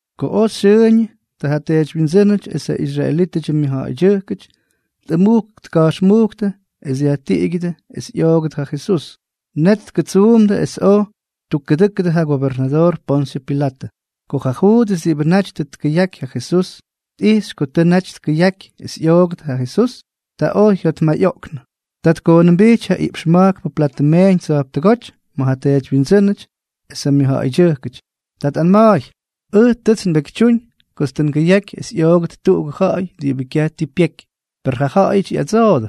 Ko oj xyʉʉñʉ, ta ja teedywyindsʉ́nʉty es ja israelítʉdyʉ myʉjja̱ꞌa̱ydyʉjkʉty tꞌʉmujk tka̱jxmujktʉ es dyajtiꞌigyʉdʉ es ꞌyoogʉt ja Jesús. Net tkʉtsuumdʉ es oj ttukkʉdʉ́kʉdʉ ja gobernadoor Ponsyʉ Pilatʉ. Ko ja Juudʉs diꞌibʉ naty tʉ tkʉyaky ja Jesús, tꞌijxy ko tʉ naty tkʉyaky es ꞌyoogʉt ja Jesús, ta oj jyajotmayꞌoꞌknʉ. Ta tkoonʉmbijty ja iꞌpx ma̱jkpʉ platʉ meeñ tsa̱jptʉgóty ma̱ ja teedywyindsʉ́nʉty es ja mʉjja̱ꞌa̱ydyʉjkʉty. Ta tꞌanma̱a̱y: —Ʉj tʉts nbekytyúñ kots tʉ ngʉyaky es ꞌyoogʉt tuꞌugʉ ja̱ꞌa̱y diꞌibʉ kyaj tii pyeky. Per jaꞌajʉty ꞌyadsoojʉ: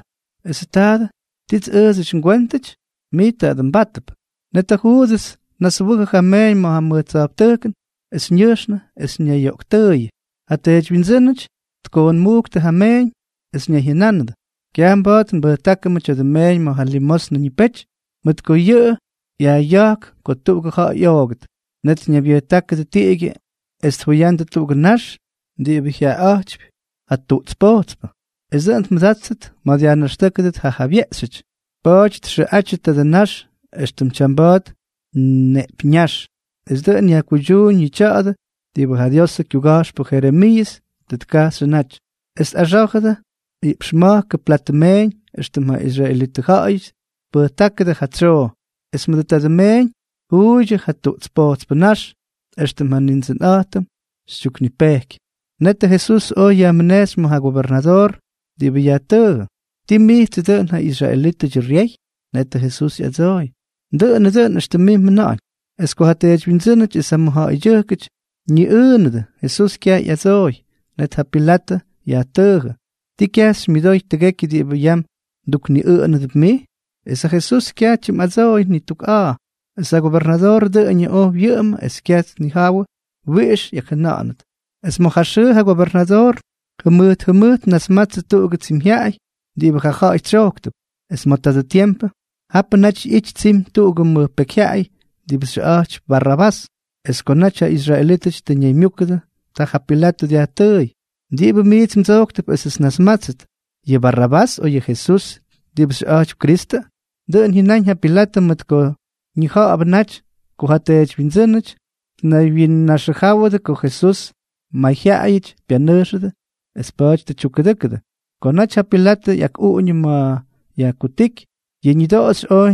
—Esʉ taadʉ, ¿tits ʉʉdsʉty ngwéntʉty? ¡Mij taadʉ mbátʉp! Net ja Juudʉs tnaswʉjʉ ja meeñ ma̱ mʉj tsa̱jptʉjkʉn, es ñʉjxnʉ es ñayyoꞌktʉʉyʉ. Ja teedywyindsʉ́nʉty tkoonmujktʉ ja meeñ, es ñayjyʉnánʉdʉ: —Kyaj mba̱a̱t nbʉjtákʉmʉ tya̱dʉ meeñ ma̱ ja limosnʉ ñipety, mʉt ko yʉꞌʉ yajꞌya̱jk ko tuꞌugʉ ja̱ꞌa̱y ꞌyoogʉt. Net ñaybyʉjtákʉdʉ tiꞌigyʉ es tjuyandʉ tuꞌugʉ nax diꞌibʉ jyaꞌaꞌa̱jtypy ja tuꞌts pojtspʉ, es dʉꞌʉn tmʉdáttʉt ma̱ dyajnaxtʉ́kʉdʉt ja jabyeꞌxyʉty. Pa̱a̱ty txʉꞌatyʉ tadʉ nax extʉ tyamba̱a̱t neꞌpyññáx. Es dʉꞌʉn yajkuydyuuñ yʉ tya̱a̱dʉ diꞌibʉ ja Diosʉ kyuga̱jxpʉ Jeremiiʉs tʉ tkajxyʉ naty: “Es tꞌaxá̱jʉdʉ iꞌpx ma̱jkʉ platʉ meeñ, éxtʉm ja israelitʉ ja̱ꞌa̱yʉty tpʉjtákʉdʉ ja tsyoo, es mʉdʉ tadʉ meeñ tjuuydyʉ ja tuꞌts pojtspʉ ñax, éxtʉm ja Nindsʉnꞌa̱jtʉm xytyuknipejky.” Net Jesús oj yajmʉnejxy ma̱ ja gobernadoor, diꞌibʉ yajtʉʉjʉ: —¿Tii mijtsʉ dʉꞌʉn ja israelítʉdyʉ ryey? Netʉ Jesús ꞌyadsooy: —Dʉꞌʉnʉ dʉꞌʉn éxtʉm mij mjʉna̱ꞌa̱ñʉn. Es ko ja teedywyindsʉ́nʉty es ja mʉjja̱ꞌa̱ydyʉjkʉty ñiꞌʉʉnʉdʉ, Jesús kyaj ꞌyadsooy. Net ja Pilatʉ yajtʉʉjʉ: —¿Tii kyaj xymyʉdoy tʉgekyʉ diꞌibʉ yam mdukniꞌʉꞌʉnʉdʉp mij? Es ja Jesús kyaj tyimꞌadsooy ni tuk a̱a̱. Es ja gobernadoor dʉꞌʉñʉ oj wyʉꞌʉmʉ es kyaj tnijawʉ wiꞌix ꞌyakjʉna̱ꞌa̱nʉt. Es ma̱ ja xʉʉ ja gobernadoor jʉmʉjt jʉmʉjt tnasmatsʉ tuꞌugʉ tsimyjyaꞌay diꞌibʉ ja ja̱ꞌa̱yʉty tsyojktʉp. Es ma̱ tadʉ tiempʉ, japʉ naty ꞌyity tsimy tuꞌugʉ mʉj pekyjyaꞌay diꞌibʉ xyʉꞌa̱jtypy Barrabás. Es ko naty ja israelítʉty tʉ ñaymyúkʉdʉ, ta ja Pilatʉ dyajtʉʉy: —¿Diꞌibʉ miits mdsojktʉp esʉts nnasmátsʉt, yʉ Barrabás, o yʉ Jesús diꞌibʉ xyʉꞌa̱jtypy Kristʉ? Dʉꞌʉn jyʉnáñ ja Pilatʉ mʉt ko ñija̱ꞌa̱bʉ naty ko ja teedywyindsʉ́nʉty tnaywyinnaxʉjáwʉdʉ ko Jesús may ja ja̱ꞌa̱yʉty pyanʉjxʉdʉ es pa̱a̱ty tʉ tyukkʉdʉ́kʉdʉ. Ko naty ja Pilatʉ ꞌyakꞌuꞌuñʉ ma̱ yajkutíky, yʉ ñʉdoꞌoxy oj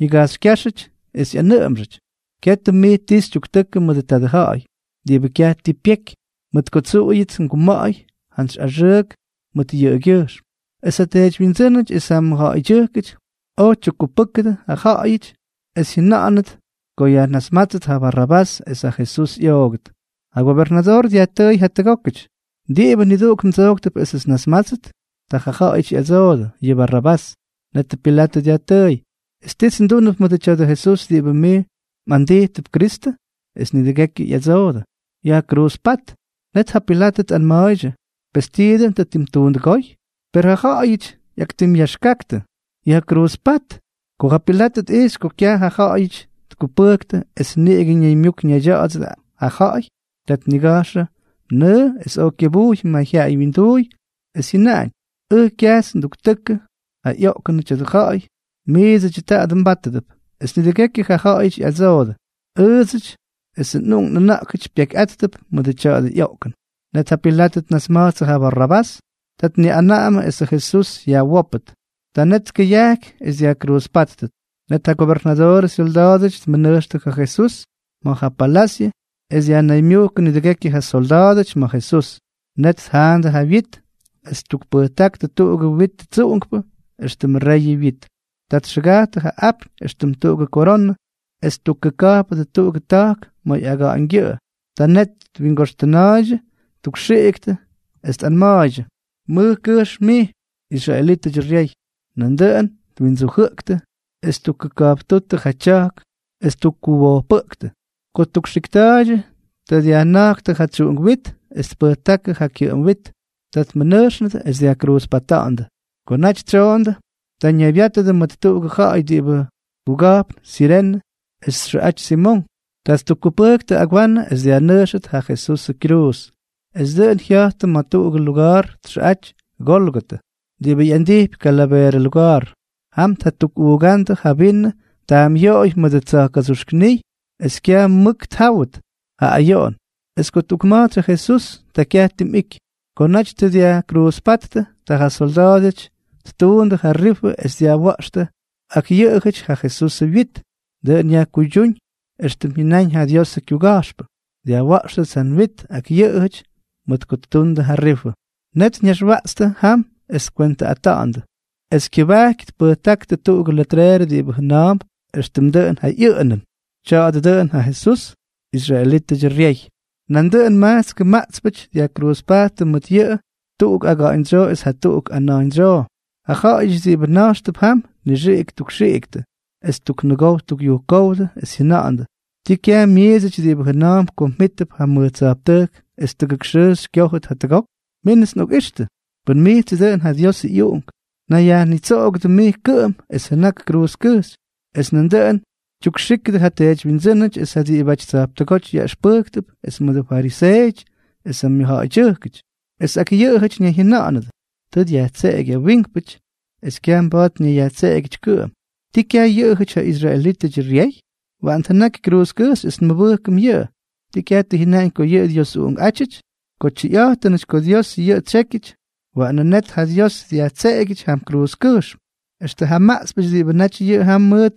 ñigajxykyáxʉty es ꞌyanʉꞌʉmxʉty: —Katʉ mij ti xytyuktʉkʉ mʉdʉ tadʉ ja̱ꞌa̱y diꞌibʉ kyaj tii pyeky, mʉt ko tsuꞌuyʉts nguma̱ꞌa̱y jantsy axʉʉk mʉt yʉꞌʉgyʉjxm. Es ja teedywyindsʉ́nʉty es ja mʉjja̱ꞌa̱ydyʉjkʉty oj ttukkupʉktʉ ja ja̱ꞌa̱yʉty es jyʉna̱ꞌa̱nʉt ko yajnasmátsʉt ja Barrabás es ja Jesús ꞌyoogʉt. Ja gobernadoor dyajtʉʉy jatʉgókʉty: —¿Diꞌibʉ niduꞌuk mdsojktʉp esʉts nnasmátsʉt? Ta jaꞌajʉty ꞌyadsoodʉ: —Yʉ Barrabás. Net Pilatʉ dyajtʉʉy: —¿Es tits ndúnʉp mʉdʉ tya̱dʉ Jesús diꞌibʉ mij mꞌandijtʉp Kristʉ? Es nidʉgekyʉ ꞌyadsoodʉ: —¡Yajkruuzpát! Net ja Pilatʉ tꞌanma̱a̱ydyʉ: —Pes, ¿tii dʉꞌʉn tʉ ttimtuundʉgóy? Per jaꞌajʉty ꞌyaktimꞌyaxkaktʉ: —¡Yajkruuzpát! Ko ja Pilatʉ tꞌijxy ko kyaj ja ja̱ꞌa̱yʉty tkupʉktʉ es niꞌigʉ ñaymyuk ñaydya̱ꞌa̱dsʉdʉ ja ja̱ꞌa̱y, ta tnigajxʉ nʉʉ es oj kyʉbujy mayjyaꞌay wyinduuy, es jyʉnaꞌañ: —Ʉj kyajts nduktʉkʉ ja ꞌyoꞌkʉnʉ tya̱dʉ ja̱ꞌa̱y. Miidsʉdyʉ taadʉ mbátʉdʉp. Es nidʉgekyʉ ja ja̱ꞌa̱yʉty ꞌyadsoodʉ: —¡Ʉʉdsʉty es nꞌuꞌunk nꞌʉna̱ꞌkʉty pyekyꞌáttʉp mʉdʉ tya̱dʉ ꞌyoꞌkʉn! Net ja Pilatʉ tnasma̱jtsʉ ja Barrabás, ta tniꞌanaꞌamʉ esʉ Jesús yajwópʉt. Ta net tkʉyajky es dyajkruuzpáttʉt. Net ja gobernadoorʉ syolda̱a̱dʉty tmʉnʉjxtʉ ja Jesús ma̱ ja palasyʉ es dyajnaymyujkʉ nidʉgekyʉ ja solda̱a̱dʉty ma̱ Jesús. Net tjaanʉdʉ ja wyit, es ttukpʉjtáktʉ tuꞌugʉ witʉ tsuꞌunkpʉ éxtʉmʉ reyʉ wyit. Ta txʉgajttʉ ja apyñ éxtʉm tuꞌugʉ koronʉ, es tpʉjtákʉdʉ kyʉba̱jkkʉjxm, es ttukkʉka̱jpʉdʉ tuꞌugʉ ta̱jk ma̱ ꞌyaga̱ꞌa̱ñgyʉꞌʉ. Ta net twingoxtʉna̱a̱ydyʉ, ttukxiꞌktʉ es tꞌanma̱a̱ydyʉ: —¡Mʉj kʉjxm mij, israelítʉdyʉ ryey! Nandʉꞌʉn twindsujʉꞌktʉ, es ttukkʉka̱jptúttʉ ja tya̱jk es ttukkuwojpʉꞌktʉ. Ko ttukxikta̱a̱ydyʉ, ta dyajjʉna̱jktʉ ja tsuꞌunk wit, es ttukpʉjtáktʉ ja kyʉꞌʉm wit. Ta tmʉnʉjxnʉdʉ es dyajkruuzpata̱ꞌa̱ndʉ. Ko naty tsyoondʉ, ta ñaybyátʉdʉ mʉt tuꞌugʉ ja̱ꞌa̱y diꞌibʉ kuga̱jpn Sirene es txʉꞌaty Simonk. Ta ttukkupʉjktʉ agwanʉ es dyajnʉjxʉt ja Jesusʉ kyruuz. Es dʉꞌʉn jya̱jtʉ ma̱ tuꞌugʉ luga̱a̱r txʉꞌaty Gólgotʉ, diꞌibʉ ꞌyandijpy Kalaveerʉ Luga̱a̱r. Jam tjatukꞌuugándʉ ja vinʉ taamꞌyoꞌoy mʉdʉ tsa̱jka̱dsuxknijy es kyaj mʉk tjáwʉt ja ayoꞌon. Es ko tꞌukma̱jtsy ja Jesús, ta kyaj tim ꞌyiky. Ko naty tʉ dyajkruuzpáttʉ, ta ja solda̱a̱dʉty ttuundʉ ja rifʉ es dyajwa̱ꞌxtʉ ak yʉꞌʉjʉty ja Jesusʉ wyit. Dʉꞌʉn yajkuydyuuñ éxtʉm jyʉnáñ ja Diosʉ kyuga̱jxpʉ: “Dyajwa̱ꞌxtʉts ja nwit ak yʉꞌʉjʉty mʉt ko ttuundʉ ja rifʉ.” Net ñaxwaꞌtstʉ jam es tkwentʉꞌata̱ꞌa̱ndʉ. Es kyʉbajky tpʉjtákʉdʉ tuꞌugʉ letreerʉ diꞌibʉ jʉna̱a̱mp éxtʉmʉ dʉꞌʉn ja ꞌyʉꞌʉnʉn: “Tya̱a̱dʉ dʉꞌʉn ja Jesús, israelítʉdyʉ ryey.” Nandʉꞌʉn majtskʉ maꞌtspʉty dyajkruuzpajttʉ mʉt yʉꞌʉ, tuꞌuk aga̱ꞌa̱ñdsyoo es jatuꞌuk ana̱jñdsyoo. Ja ja̱ꞌa̱yʉty diꞌibʉ na̱jxtʉp jam, tnixiꞌik ttukxiꞌiktʉ es ttuknʉgow ttukꞌyujkówdʉ, es jyʉna̱ꞌa̱ndʉ: —¿Tii kyaj mmijtsʉty diꞌibʉ jʉna̱a̱mp ko mjítʉp ja mʉj tsa̱jptʉjk es tʉgʉk xʉʉ xykyójʉt jatʉgok? Mínʉts nꞌokꞌixtʉ. Pʉn mijtsʉ dʉꞌʉn ja Diosʉ ꞌyUꞌunk, nayyajnitsoꞌogʉdʉ mij kʉꞌʉm es jʉnak kruuzkʉjxy. Es nandʉꞌʉn tyukxíkʉdʉ ja teedywyindsʉ́nʉty es ja diꞌibʉty tsa̱jptʉgóty yaꞌʉxpʉjktʉp es mʉdʉ fariseeʉty es ja mʉjja̱ꞌa̱ydyʉjkʉty. Es ak yʉꞌʉjʉty ñayjyʉna̱ꞌa̱nʉdʉ: —Tʉ dyajtseꞌeky ja wiinkpʉty es kyaj mba̱a̱t ñayyajtseꞌegyʉty kʉꞌʉm. ¿Tii kyaj yʉꞌʉjʉty ja israelítʉdyʉ ryey? Waꞌan tjʉnaky kruuzkʉjxy es nmʉbʉjkʉm yʉꞌʉ. ¿Tii kyaj tʉ jyʉnaꞌañ ko yʉꞌʉ Dios ꞌyUꞌunkꞌátyʉty? Ko tyʉyꞌa̱jtʉnʉty ko Dios yʉꞌʉ tsyékyʉty, ¡waꞌanʉ net ja Dios dyajtseꞌegyʉty jam kruuzkʉjxm! Extʉ ja maꞌtspʉty diꞌibʉ naty jam mʉt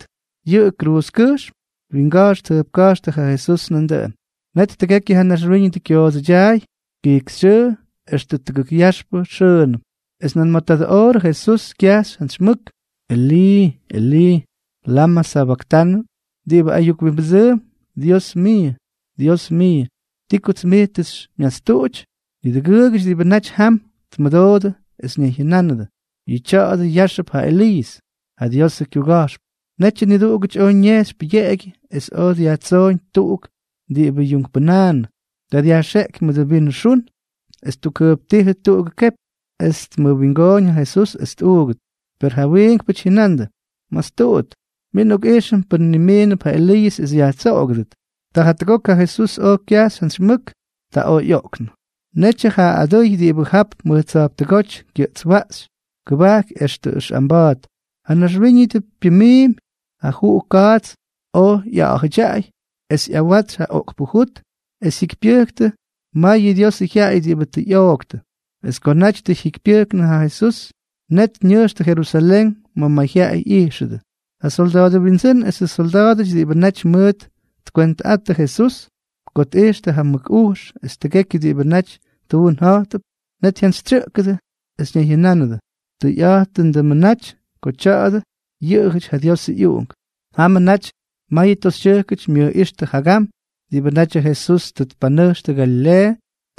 yʉꞌʉ kruuzkʉjxy, twinga̱jx tjʉjpka̱jxtʉ ja Jesús nandʉꞌʉn. Net tʉgekyʉ ja naxwíñʉdʉ kyoodsʉdyaay kijkyxyʉʉ extʉ tʉgʉk yaxp xʉʉnʉm. Es nan ma̱ tadʉ oorʉ Jesús kyajxy jantsy mʉk: —Elii, Elii, ¿lamʉ sabaktanʉ? Diꞌibʉ ayuk wimbʉdsʉʉmp: “Dios miiʉ, Dios miiʉ, ¿ti kots mij tʉ xymyastuꞌuty?” Niduꞌugʉty diꞌibʉ naty jam, tmʉdoodʉ es ñayjyʉnánʉdʉ: —Yʉꞌʉ tya̱a̱dʉ yáxʉp ja Eliiʉs, ja Diosʉ kyuga̱jxpʉ. Netyʉ niduꞌugʉty oj ñejxy pʉyeꞌegyʉ es oj dyajtsooñ tuꞌuk diꞌibʉ yuunkpʉnaanʉ. Ta dyajxeꞌky mʉdʉ vinʉ xun, es ttukjʉjptíjʉ tuꞌugʉ kepy, es tmʉwingooñ ja Jesús es tmuugʉt. Per ja wiinkpʉty jyʉnandʉ: —¡Mastuꞌut! Min nꞌokꞌijxʉm pʉn nimiinʉp ja Eliiʉs es yajtsoꞌogʉdʉt. Ta jatʉgok ja Jesús oj kyajxy jantsy mʉk. Ta oj ꞌyoꞌknʉ. Netyʉ ja adʉy diꞌibʉ jap mʉj tsa̱jptʉgóty kyʉꞌtswaꞌxy kʉbajky extʉ ʉxꞌamba̱a̱t, ja naxwíñʉdʉ pyʉmiimy, ja juꞌu kaats oj ꞌya̱ꞌa̱jʉdyaꞌay, es ꞌyawatsy ja oꞌkpʉ jut, es jyikypyʉjktʉ mayʉ Diosʉ jyaꞌay diꞌibʉ tʉ ꞌyooktʉ. Es ko naty tʉ jyikypyʉjknʉ ja Jesús, net ñʉjxtʉ Jerusalén ma̱ mayjyaꞌay ꞌyijxʉdʉ. Ja solda̱a̱dʉ windsʉ́n esʉ syolda̱a̱dʉty diꞌibʉ naty mʉʉt tkwentʉꞌattʉ Jesús, ko tꞌijxtʉ ja mʉk ujx es tʉgekyʉ diꞌibʉ naty tuun ja̱jtʉp, net jyantsytsyʉꞌkʉdʉ es ñayjyʉnánʉdʉ: —¡Tʉyꞌa̱jtʉndʉmʉ naty ko tya̱a̱dʉ yʉꞌʉjʉty ja Diosʉ ꞌyUꞌunk! Jamʉ naty mayʉ toxytyʉjkʉty myʉjꞌíxtʉ jagam diꞌibʉ natyʉ Jesús tʉ tpanʉjxtʉ Galileeʉ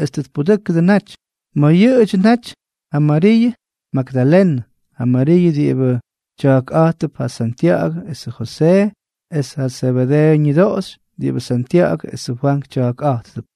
es tʉ tpudʉ́kʉdʉ naty. Ma̱ yʉꞌʉdyʉ naty ja Mariiʉ Magdalenʉ, ja Mariiʉ diꞌibʉ tya̱a̱kꞌa̱jtʉp ja Santya̱ꞌa̱gʉ esʉ Josee, es ja Zebedeeʉ ñʉdoꞌoxy diꞌibʉ Santya̱ꞌa̱gʉ esʉ Fwank tya̱a̱kꞌa̱jtʉp.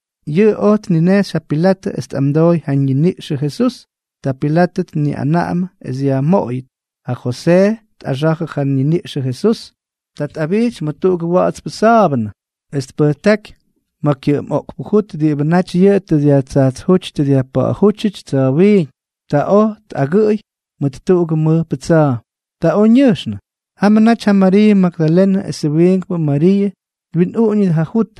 Yʉꞌʉ oj tninejxy ja Pilatʉ es tꞌamdooy ja ñiniꞌxʉ Jesús. Ta Pilatʉ tniꞌanaꞌamʉ es yajmoꞌoyʉt. Ja Josee tꞌaxa̱jʉ ja ñiniꞌxʉ Jesús. Ta tꞌabijty mʉt tuꞌugʉ wa̱ꞌa̱tspʉ sa̱a̱bʉnʉ, es tpʉjtáky ma̱ kyʉꞌʉm oꞌkpʉ jut diꞌibʉ naty yʉꞌʉ tʉ dyajtsajtsjúty dyajpa̱ꞌa̱jútyʉty tsa̱wiiñ. Ta oj tꞌagʉꞌʉy mʉt tuꞌugʉ mʉjpʉ tsa̱a̱. Ta oj ñʉjxnʉ. Jamʉ naty ja Mariiʉ Magdalenʉ esʉ wiinkpʉ Mariiʉ twinꞌuꞌuñʉdʉ ja jut.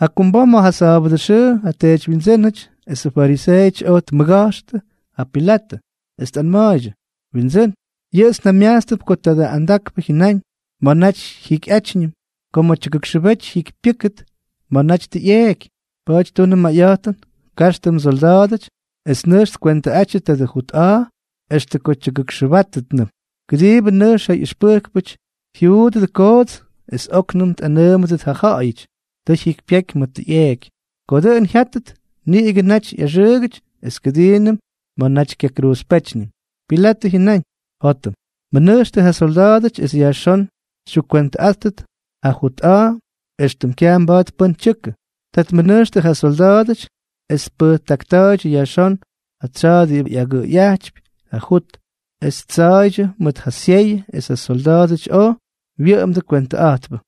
Jakumbom ma̱ ja sa̱a̱bʉdʉ xʉʉ, ja teedywyindsʉ́nʉty esʉ fariseeʉty oj tmʉga̱jxtʉ ja Pilatʉ, es tꞌanma̱a̱ydyʉ: —Windsʉ́n, yʉꞌʉts njamyajtstʉp ko tadʉ andakpʉ jyʉnáñ ma̱ naty ꞌyakjikyꞌátyñʉm, ko ma̱ tyʉgʉkxʉbety jyikypyʉ́kʉt ma̱ naty tʉ ꞌyeeky. Pa̱a̱ty tunʉ mayꞌa̱jtʉn, kaxtʉ msolda̱a̱dʉty es nʉjx tkwentʉꞌatyʉ tadʉ jut a̱a̱ extʉ ko tyʉgʉkxʉbátʉtnʉm, kʉdiibʉ nʉjx ja ꞌyʉxpʉjkpʉty jyuudʉdʉ koots, es óknʉm tꞌanʉʉmʉdʉt ja ja̱ꞌa̱yʉty: “Tʉ jyikypyeky ma̱ tʉ ꞌyeeky.” Ko dʉꞌʉn jyátʉt, niꞌigʉ naty ꞌyaxʉʉgʉty es kʉdiinʉm ma̱ naty kyakruuzpétyñʉm. Pilatʉ jyʉnáñ: —Jótʉm. Mʉnʉjxtʉ ja solda̱a̱dʉty es yajxón xytyukkwentʉꞌáttʉt ja jut a̱a̱ éxtʉm kyaj mba̱a̱t pʉ́n tyʉkʉ. Ta tmʉnʉjxtʉ ja solda̱a̱dʉty es tpʉjtakta̱a̱ydyʉ yajxón ja tsa̱a̱ diꞌibʉ agʉʉyꞌajtypy ja jut, es ttsa̱a̱ydyʉ mʉt ja syeyʉ, es ja solda̱a̱dʉty oj wyʉꞌʉmdʉ kwentʉꞌa̱jtpʉ.